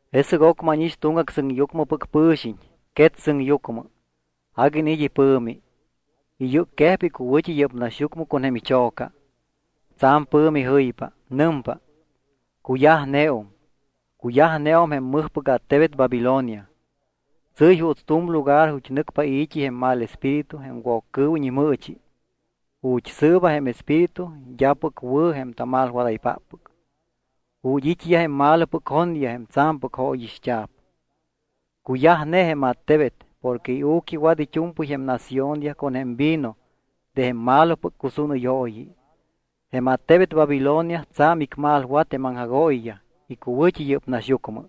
Jesɨc ocmɨ ánix tuŋgac sɨŋyucmɨpɨc pɨ̱xiñ quet sɨŋyucmɨ. Agui iniit́ ipɨ̱mi. Iyɨcquejpa icuwɨ̱t́i yɨ́p naxyucmɨ con jém icho̱ca. Tsa̱m pɨ̱mi jɨypa. Nɨmpa: —Cuyajneum, cuyajneum jém mɨjpɨc attebet Babilonia. Tsɨ́y juuts tu̱m lugar ju̱t́ nɨcpa i̱t́i jém mal espíritu jém Woccɨɨwiñ imɨɨchi, ju̱t́ sɨɨba jém espíritu d́apɨc wɨ̱ jém tamalwadaypáppɨc, ju̱t́ it́yaj jém malopɨc jonyaj jém tsa̱mpɨc jóyixt́a̱p. Cuyajne jém attebet porque iu̱quiwat it́u̱mpɨy jém naciónyaj con jém vino de jém malopɨc cusúnɨyooyi. Jém attebet Babilonia tsa̱m icmalwat jém aŋjagooyiyaj icuwɨ̱t́i yɨ́p naxyucmɨ.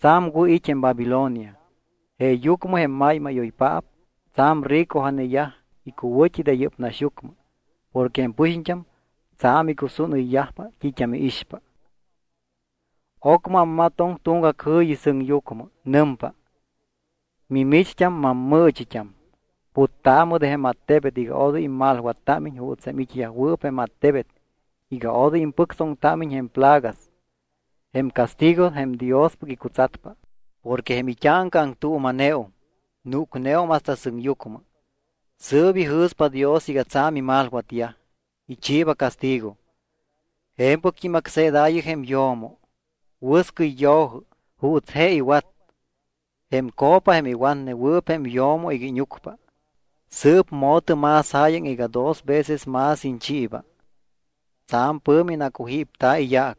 Tsa̱m wɨ̱ it́ jém Babilonia, jeeyucmɨ jém máymáyoypaap tsa̱m ricoja̱neyaj icuwɨ̱t́i de yɨ́p naxyucmɨ porque jém pɨxiñt́am tsa̱m icusúnɨyyajpa t́it́am iixpa. Ocmɨ ammatoŋ tuŋgac jɨ̱yi sɨŋyucmɨ. Nɨmpa: —Mimicht́am mammɨɨchit́am, puttaamɨ de jém attebet iga odoy immalwattámiñ juuts jém it́yajwɨɨp jém attebet iga odoy impɨctsoŋtámiñ jém plagas, jém castigo jém Diospɨc icutsatpa. Porque jém it́áŋca aŋtuuma̱neum, núcneum hasta sɨŋyucmɨ. Sɨɨp ijɨ̱spa Dios iga tsa̱m imalwatyaj, ichiiba castigo. Je̱mpɨct́im acseedaayɨ jém yo̱mo. Wɨscɨy yo̱jɨ juuts je iwat. Jém copa jém iwatnewɨɨp jém yo̱mo iga íñucpa, sɨɨp mo̱tɨ más jáyaŋ iga dos veces más iñchiiba. Tsa̱m pɨ̱mi nacujípta̱ iyaac.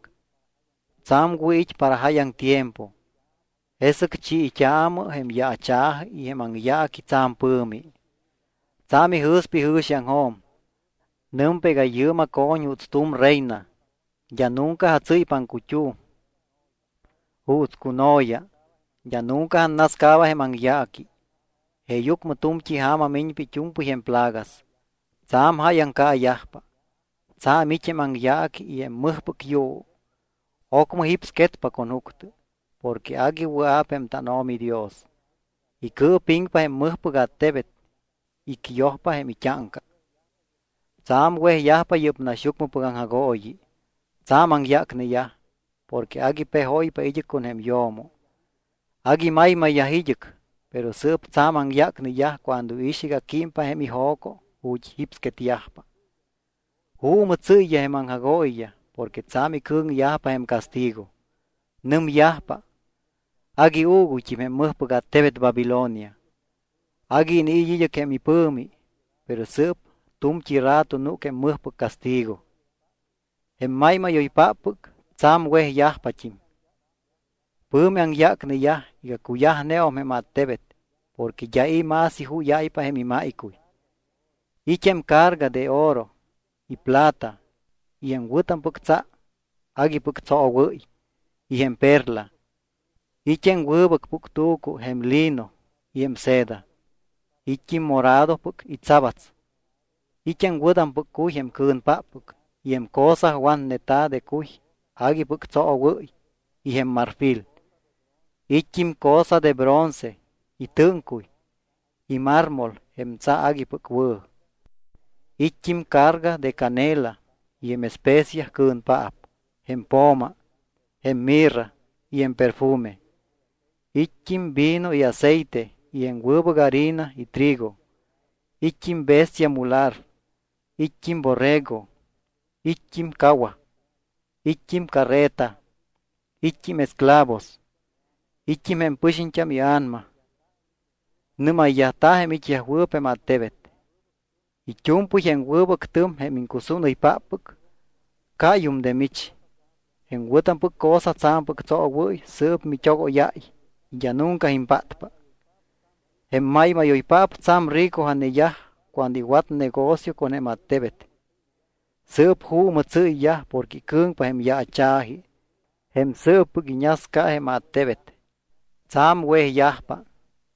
Tsa̱m wɨ̱ it́ para jáyaŋ tiempo. Jesɨc chiit́aamɨ jém yaacha̱ji y jém aŋyaaqui tsa̱m pɨ̱mi. Tsa̱m ijɨ̱spa ijɨ̱xiaŋjo̱m. Nɨmpa iga yɨɨm aco̱ñ juuts tu̱m reyna. D́a nunca atsɨ́ypa aŋcut́um juuts cuno̱ya. D́a nunca annascaaba jém aŋyaaqui. Jeeyucmɨ tu̱mt́i ja̱ma miñpa it́u̱mpɨy jém plagas. Tsa̱m jáyaŋ caayajpa, tsa̱m it́ jém aŋyaaqui y jém mɨjpɨc yuu. Ocmɨ jípsquetpa con juctɨ. Porque agui wɨa̱p jém tánO̱mi Dios, icɨɨpiŋpa jém mɨjpɨc attebet, icyojpa jém it́áŋca. Tsa̱m wejyajpa yɨ́p naxyucmɨpɨc aŋjagooyi, tsa̱m aŋyácneyaj, porque agui pejóypa id́ɨc con jém yo̱mo, agui maymayyaj id́ɨc. Pero sɨɨp tsa̱m aŋyácneyaj cuando iix iga químpa jém ijo̱co ju̱t́ jípsquetyajpa. Juumɨ tsɨ́yyaj jém aŋjagooyiyaj porque tsa̱m icɨ̱ŋyajpa jém castigo. Nɨmyajpa: —Agui uuguyt́im jém mɨjpɨc attebet Babilonia, agui iniit́ id́ɨc jém ipɨ̱mi, pero sɨɨp tu̱mt́i rato núc jém mɨjpɨc castigo. Jém máymáyoyyajpáppɨc tsa̱m wejyajpat́im. Pɨ̱mi aŋyácneyaj iga cuyajneum jém attebet porque d́a i̱ más ijúyáypa jém imáycuy. It́ jém carga de oro y plata y jém wɨ̱tampɨc tsa aguipɨc tsoowɨ́y y jém perla. It́ jém wɨbɨc puctu̱cu jém lino y jém seda. It́t́im moradopɨc y tsabats. It́ jém wɨ̱tampɨc cuy jém cɨ̱npáppɨc y jém cosa watneta̱ de cuy aguipɨc tsoowɨ́y y jém marfil. It́t́im cosa de bronce y tɨ́ŋcuy y mármol jém tsa aguipɨc wɨ̱. It́t́im carga de canela y jém especia cɨ̱npaap, jém po̱ma, jém mirra y jém perfume. It́t́im vino y aceite y jém wɨbɨc harina y trigo. It́t́im bestia mular. It́t́im borrego. It́t́im cawaj. It́t́im carreta. It́t́im esclavos. It́t́im jém pɨxiñt́am ia̱nama. Nɨ́mayyajta̱ jém it́yajwɨɨp jém attebet: —It́u̱mpɨy jém wɨbɨc tɨm jém iŋcusúnɨypáppɨc cáyum de mich. Jém wɨ̱tampɨc cosa tsa̱mpɨc tsoowɨ́y sɨɨp mit́ogóyáy y d́a nunca impátpa. Jém máymáyoypaap tsa̱m ricoja̱neyaj cuando iwat negocio con jém attebet. Sɨɨp juumɨ tsɨ́yyaj porque icɨ̱ŋpa jém yaacha̱ji jém sɨɨppɨc iñasca jém attebet. Tsa̱m wejyajpa,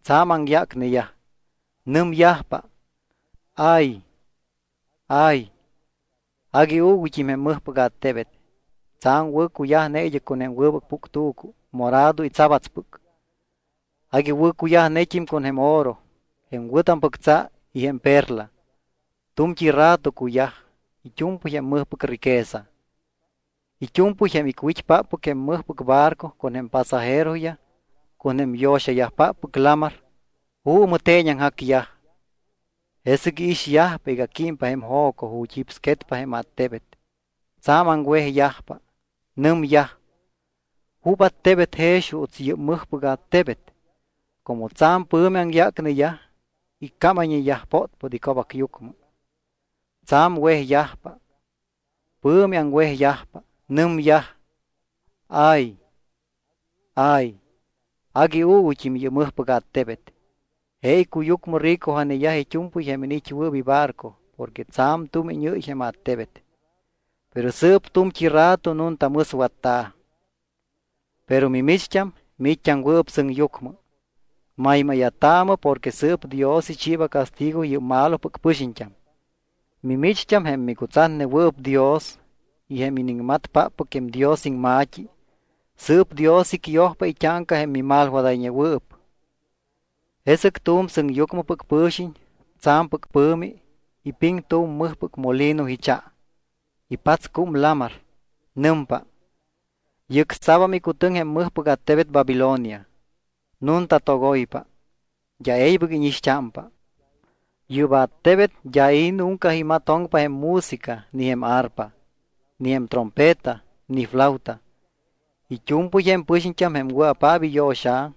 tsa̱m aŋyácneyaj. Nɨmyajpa: —¡Ay, ay! Agui uuguyt́im jém mɨjpɨc attebet. Tsa̱m wɨ̱cuyajne id́ɨc con jém wɨbɨc puctu̱cu morado y tsabatspɨc. Agui wɨ̱cuyajnet́im con jém oro, jém wɨ̱tampɨc tsa y jém perla. Tu̱mt́i rato cuyaj it́u̱mpɨy jém mɨjpɨc riqueza. It́u̱mpɨy jém icwit́páppɨc jém mɨjpɨc barco con jém pasajeroyaj con jém yo̱xayajpáppɨc lamar, juumɨ teeñaŋjacyaj. Jesɨc iixyajpa iga químpa jém jo̱co ju̱t́ jípsquetpa jém attebet, tsa̱m aŋwejyajpa. Nɨmyaj: —¿Jup attebet jex juuts yɨ́p mɨjpɨc attebet? Como tsa̱m pɨ̱mi aŋyácneyaj iccámayñeyaj pótpót ico̱bacyucmɨ. Tsa̱m wejyajpa. Pɨ̱mi aŋwejyajpa. Nɨmyaj: —¡Ay, ay! Agui uuguyt́im yɨ́p mɨjpɨc attebet. Je icuyucmɨ ricoja̱neyaj it́u̱mpɨy jém iniit́wɨɨp ibarco porque tsa̱m tumiñɨ́y jém attebet. Pero sɨɨp tu̱mt́i rato nunta mɨswatta̱. Pero mimicht́am, miit́t́aŋwɨɨp sɨŋyucmɨ, maymáya̱taamɨ porque sɨɨp Dios ichiiba castigo yɨ́p malopɨc pɨxiñt́am. Mimicht́am jém micutsatnewɨɨp Dios y jém iniŋmatpáppɨc jém Dios iŋma̱t́i, sɨɨp Dios icyojpa it́áŋca jém mimalwadayñewɨɨp. Jesɨc tu̱m sɨŋyucmɨpɨc pɨ̱xiñ, tsa̱mpɨc pɨ̱mi, ipiŋ tu̱m mɨjpɨc molino icha. Ipatscúm lamar. Nɨmpa: —Yɨcsa̱bam icutɨŋ jém mɨjpɨc attebet Babilonia. Nunta togoypa. D́a e̱ybɨc íñixt́ámpa. Yɨ́p attebet d́a i̱ nunca imatoŋpa jém música ni jém arpa, ni jém trompeta ni flauta. It́u̱mpɨy jém pɨxiñt́am jém wɨa̱paap iyo̱xa̱,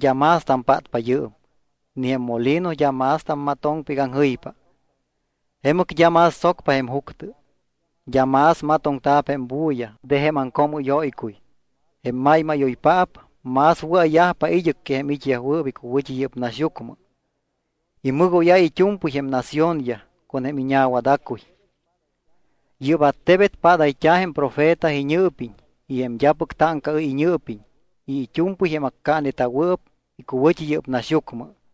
d́am más tampátpa yɨɨm, ni jém molino d́a más tammatoŋpa iga aŋjɨypa. Jemɨc d́a más tsocpa jém juctɨ. D́a más matoŋta̱p jém bulla de jém aŋcoomɨ́yóycuy. Jém máymáyoypaap más wɨa̱yajpa id́ɨc que jém it́yajwɨɨp icuwɨ̱t́i yɨ́p naxyucmɨ. Imɨgóyáy it́u̱mpɨy jém naciónyaj con jém iñawada̱cuy. Yɨ́p attebet padayt́a̱ jém profeta iñɨɨpiñ y jém d́apɨc táŋcaɨ́y iñɨɨpiñ y it́u̱mpɨy jém accaaneta̱wɨɨp icuwɨ̱t́i yɨ́p naxyucmɨ.